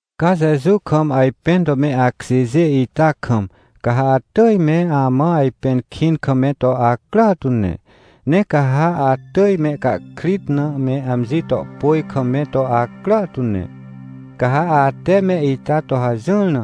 Ca Jeju kam ajpẽn to me akjêjê ita kam, ca ha atỳj me amã ajpẽn kĩn kam me to acrà tu ne. Ne ca ha atỳj mehcahkrit na me amji to pôj kam me to acrà tu ne. Ca ha ate me ita to hajỹr na,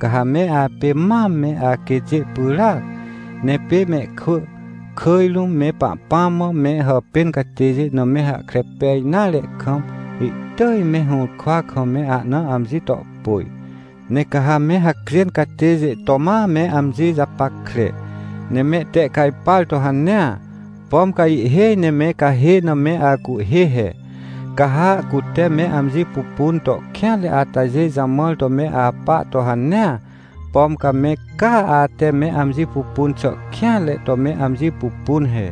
ca ha me apê mam me aquêtjê pyràac, ne pê mehkwỳ, kỳj rũm me Pahpãm mã me hàpên catêjê na me hahkre pej nare kam, ihtỳj me hũrkwa kam me ahna amji to pôj. Ne ca ha me hacjên catêjê to ma me amji japackre, ne mehtehcajpar to hanea, pom ca ihhêj ne me cahê na me acuhhê he. Ca ha cute me amji pupun to kêanre atajê jamãr to me apa to hanea, pom ca me caa ate me amji pupun xà kêanre to me amji pupun he.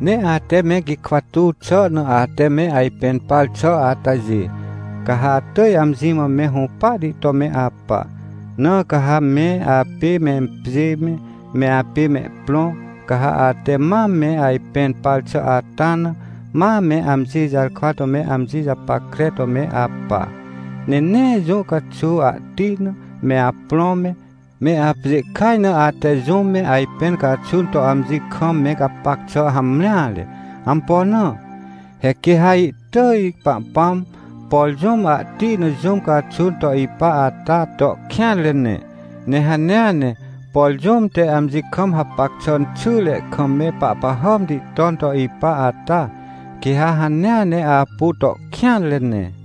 Ne ate me gikwa tuw xà na ate me ajpẽn par xà atajê, ca ha atỳj amji mã me hũpahti to me apa. Na ca ha me apê mempjê me, me apê mehprõ, ca ha ate mam me ajpẽn par xà ata na, ma me amji jarkwa to me amji japackre to me apa. Ne nee jũ caxuw ahti na, me aprõ me, me apjê kaj na ate jũm me ajpẽn caxun to amji kam me gapac xà hamreare. Ampo na? He quê ha ihtỳj Pahpãm, por jũm ahti na jũm caxun to ipa ata, to kêanre ne. Ne hanea ne, por jũm te amji kam hapac xà xyre kam me pahpahàmti ton to ipa ata, quê ha hanea ne apu to kêanre ne.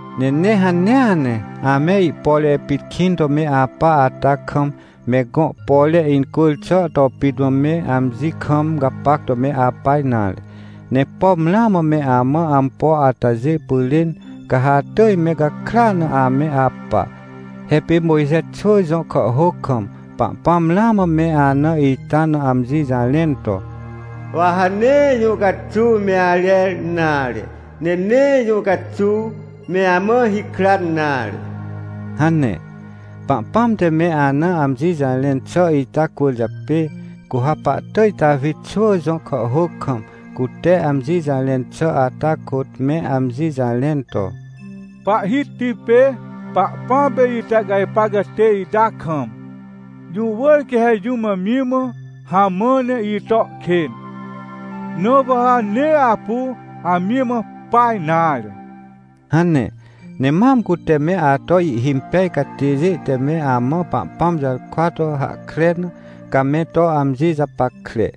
Ne nee hanea ne, ame ihpore pit kĩn to me apa ata kam, me gõ pore incwỳr xà to pit mã me amji kam gapac to me apa nare. Ne pom ramã me amã ampo atajê pyrên, ca ha atỳj me gakrya na ame apa. He pê Mojxe xwỳ jõ kàhhôc kam, Pahpãm ramã me ana ita na amji jarẽn to: “Wa ha nee jũ caxuw me arer nare, ne nee jũ caxuw me amã hikran nare” hane. Pahpãm te me ana amji jarẽn xà ita cwỳrjapê, cu ha pahtỳj Tawi xwỳ jõ kàhhôc kam, cute amji jarẽn xà ata kôt, me amji jarẽn to: “Pahhiti pê Pahpãm pê itehcajpar catê ita kam, jũ wỳr quê ha jũm amji mã hamã ne ito kên, na wa ha nee apu amji mã pa nare” hane. Ne mam cute me ato ihhimpej catêjê te me amã Pahpãm jarkwa to hahkre na, ca me to amji japackre.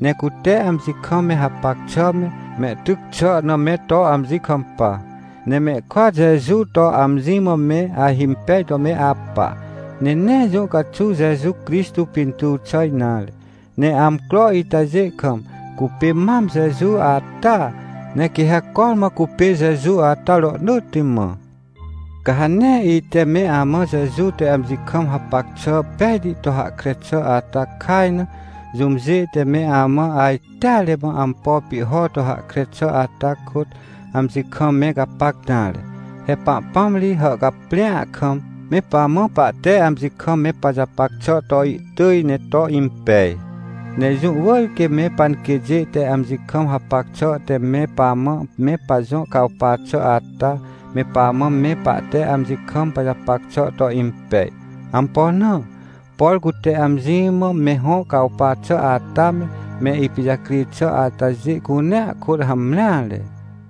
Ne cute amji kam me hapac xà me, mehtyc xà na me to amji kampa, ne mehkôat Jeju to amji mã me ahimpej to me apa. Ne nee jũ caxuw Jeju Crixtô pintuw xà nare. Ne amcro itajê kam, cupê mam Jeju ataa, ne quê ha cormã cupê Jeju ata rohnỳtti mã. Ca ha nee ite me amã Jeju te amji kam hapac xà pejti to hahkre xà ata kaj na, jũmjê te me amã ajteare mã ampo pihho to hahkre xà ata kôt, amji kam me gapac nare. He Pahpãm ri hàhcaprĩa kam, me pamã pahte amji kam me pajapac xà to ihtỳj ne to impej. Ne jũ wỳr quê me panquêtjê te amji kam hapac xà te me pamã me pajõ cawpa xà ata, me pamã me pahte amji kam pajapac xà to impej. Ampo na? Por cute amji mã me hõ cawpa xà ata me, me ipijacri xà atajê cunea kôt hamreare.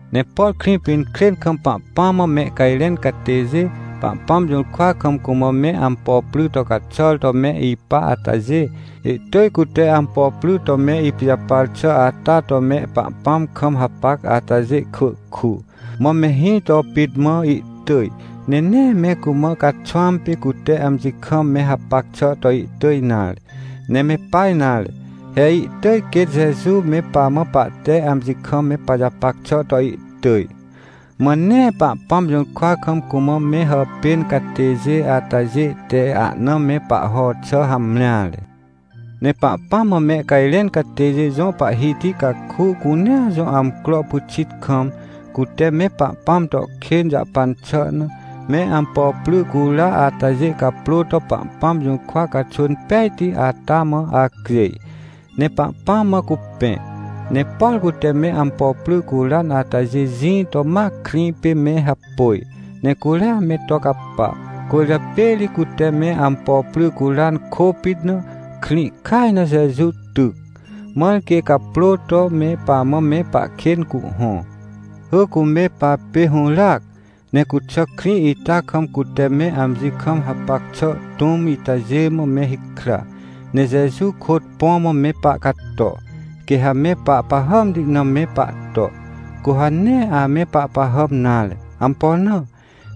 Ne por Krĩpinkrên kam Pahpãm mã mehcajrẽn catêjê Pahpãm jũrkwa kam cumã me ampo pry to caxàr to me ipa atajê, ihtỳj cute ampo pry to me ipijapar xà ata to me Pahpãm kam hapac atajê kwỳ ku, mã me hĩ to pit mã ihtỳj, ne nee me cumã caxwãm pê cute amji kam me hapac xà to ihtỳj nare. Ne me pa nare, he ihtỳj quêt Jeju me pamã pahte amji kam me pajapac xà to ihtỳj. Mã nee Pahpãm jũrkwa kam cumã me hàpên catêjê atajê te ahna me pahho xà hamreare. Ne Pahpãm mã mehcajrẽn catêjê jõ pahhiti caku cunea jõ amcro pyxit kam, cute me Pahpãm to kên jahpan xà na, me ampo pry cura atajê caprô to Pahpãm jũrkwa caxwỳn pejti ata mã acjêj, ne Pahpãm mã cupẽ. Ne por cute me ampo pry curan atajê jĩ to ma krĩ pê me hapôj, ne curia me to capa. Cwỳrjapê ri cute me ampo pry curan kôpit na, krĩ kaj na Jeju tyc, mãr quê caprô to me pamã me pahkên cuhhõ. Hỳ cu me papê hũràac, ne cuxà krĩ ita kam cute me amji kam hapac xà tũm itajê mã me hikra, ne Jeju kôt põ mã me pahcato. Quê ha me pahpahàmti na me pahto, cu ha nee ame pahpahàm nare. Ampo na?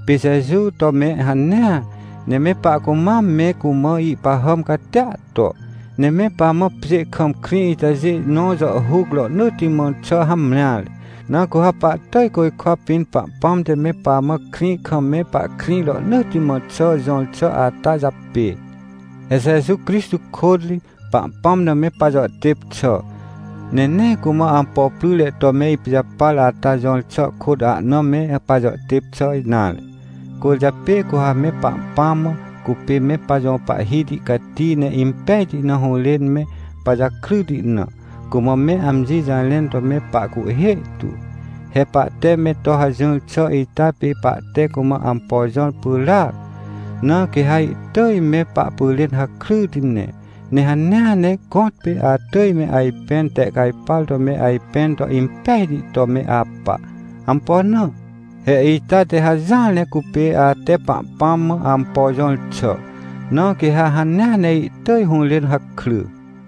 Pê Jeju to me hanea, ne me pahcumam me cumã ihpahàm catia to. Ne me pamã pjê kam krĩ itajê nõ jàhhuc rohnỳtti mã xà hamreare, na cu ha pahtỳj côjkwa pĩn Pahpãm te me pamã krĩ kam me pahkrĩ rohnỳtti mã xà jõr xà ata japê. He Jeju Crixtô kôt ri, Pahpãm na me pajàhtêp xà, ne nee cumã ampo pryre to me ipijapar ata jõr xà kôt ahna me pajàhtêp xà nare. Cwỳrjapê cu ha me Pahpãm mã cupê me pajõ Pahhiti cati ne impejti na hũrên me pajakryti na, cumã me amji jarẽn to me pahcuhhê tu. He pahte me to hajỹr xà ita pê pahte cumã ampo jõr pyràac, na quê ha ihtỳj me pahpyrên hakryti ne. Ne hanea ne gõtpê atỳj me ajpẽn tehcajpar to me ajpẽn to impejti to me apa. Ampo na? He ita te hajỹar ne cupê ate Pahpãm mã ampo jõr xà. Na quê ha hanea ne ihtỳj hũrên hakry.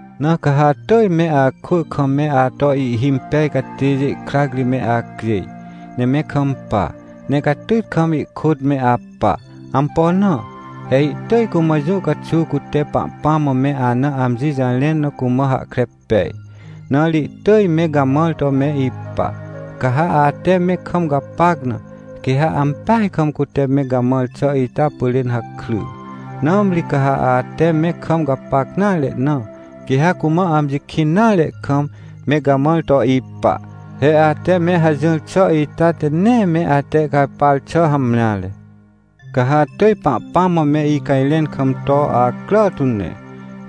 Na ca ha atỳj me akwỳ kam me ato ihhimpej catêjê krac ri me acjêj, ne me kampa, ne catyt kam ihkôt me apa. Ampo na? He ihtỳj cumã jũ caxuw cute Pahpãm mã me ana amji jarẽn na cumã hahkre pej, na ri ihtỳj me gamãr to me ipa. Ca ha ate me kam gapac na, quê ha ampeaj kam cute me gamãr xà ita pyrên hakry, nãmri ca ha ate me kam gapac nare na, quê ha cumã amji kĩn nare kam, me gamãr to ipa. He ate me hajỹr xà ita te nee me atehcajpar xà hamreare. Ca ha atỳj Pahpãm mã me icajrẽn kam to acrà tu ne.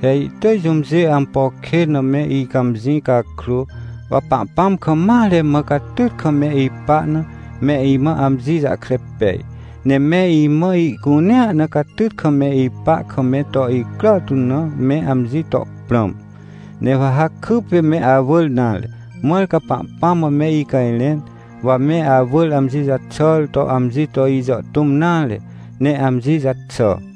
He ihtỳj jũmjê ampo kên na me icãmjĩ cakrô, wa Pahpãm kam mare mã catyt kam me ipa na, me imã amji jahkre pej. Ne me imã ihcunea na catyt kam me ipa kam me to icrà tu na me amji to prãm. Ne wa ha kypê me awỳr nare, mãr ca Pahpãm mã me icajrẽn, wa me awỳr amji jaxàr to amji to ijàhtũm nare, ne amji jaxà.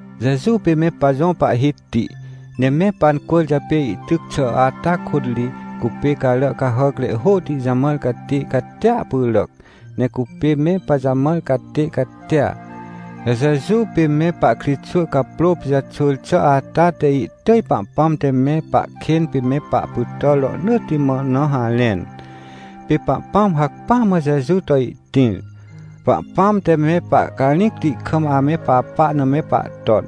Jeju pê me pajõ Pahhiti, ne me pancwỳrjapê ihtyc xà ata kôt ri, cupê carà cahàcre hôhti jamãr catê catia pyràc, ne cupê me pajamãr catê catia. He Jeju pê me pahkritxwỳ caprô pijaxwỳr xà ata te ihtỳj Pahpãm te me pahkên pê me pahpytàr rohnỳtti mã na harẽn. Pê Pahpãm hacpỹa mã Jeju to ihtĩr. Pahpãm te me pahcarĩcti kam ame papa na me pahton,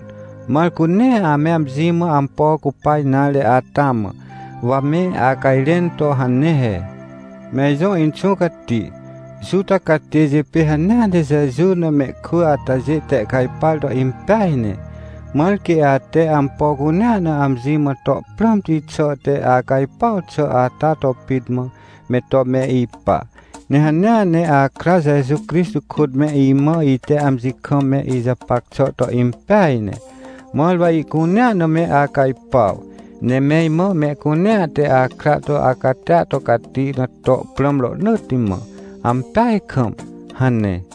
mãr cu nee ame amji mã ampo cupa nare ata mã, wa me acajrẽn to hane he: — Me ijõ Inxũ Cati, Juta catêjê pê hanea ne Jeju na mehkwỳ atajê tehcajpar to impeaj ne, mãr quê ate ampo cunea na amji mã to prãmti xà te acajpuaw xà ata to pit mã, me to me ipa. Ne hanea ne akra Jeju Crixtô kôt me imã ite amji kam me ijapac xà to impeaj ne, mãr wa ihcunea na me acajpuaw. Ne me imã mehcunea te akra to acatia to cati na to prãm rohnỳtti mã. Ampeaj kam! — hane.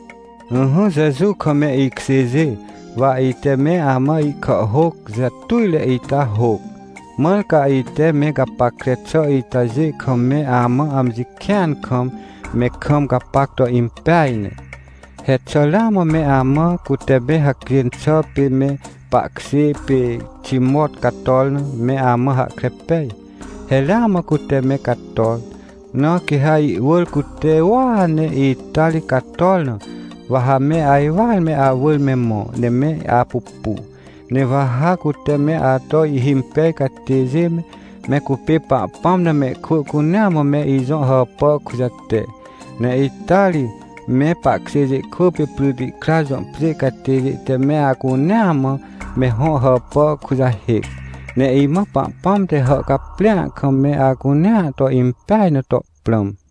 Ỹhỹ Jeju kam me ikjêjê, wa ite me amã ihkàhhôc jatujre ita hôc, mãr ca ite me gapackre xà itajê kam me amã amji kĩan kam, me kam gapac to impeaj ne. He xà ramã me amã, cute me hacjên xà pê me pahkjê pê Timot cator na, me amã hahkre pej? He ramã cute me cator. Na quê ha iwỳr cute uua ne ita ri cator na, wa ha me ajwar me awỳr me mõ ne me apupu. Ne wa ha cute me ato ihhimpej catêjê me, me cupê Pahpãm na mehkwỳ cunea mã me ijõ hàpà kujate. Ne ita ri, me pahkjêjê kwỳ pê Prytikra jõ pjê catêjê te me acunea mã me hõ hàpà kujahêc. Ne imã Pahpãm te hàhcaprĩa kam me acunea to impej na to prãm.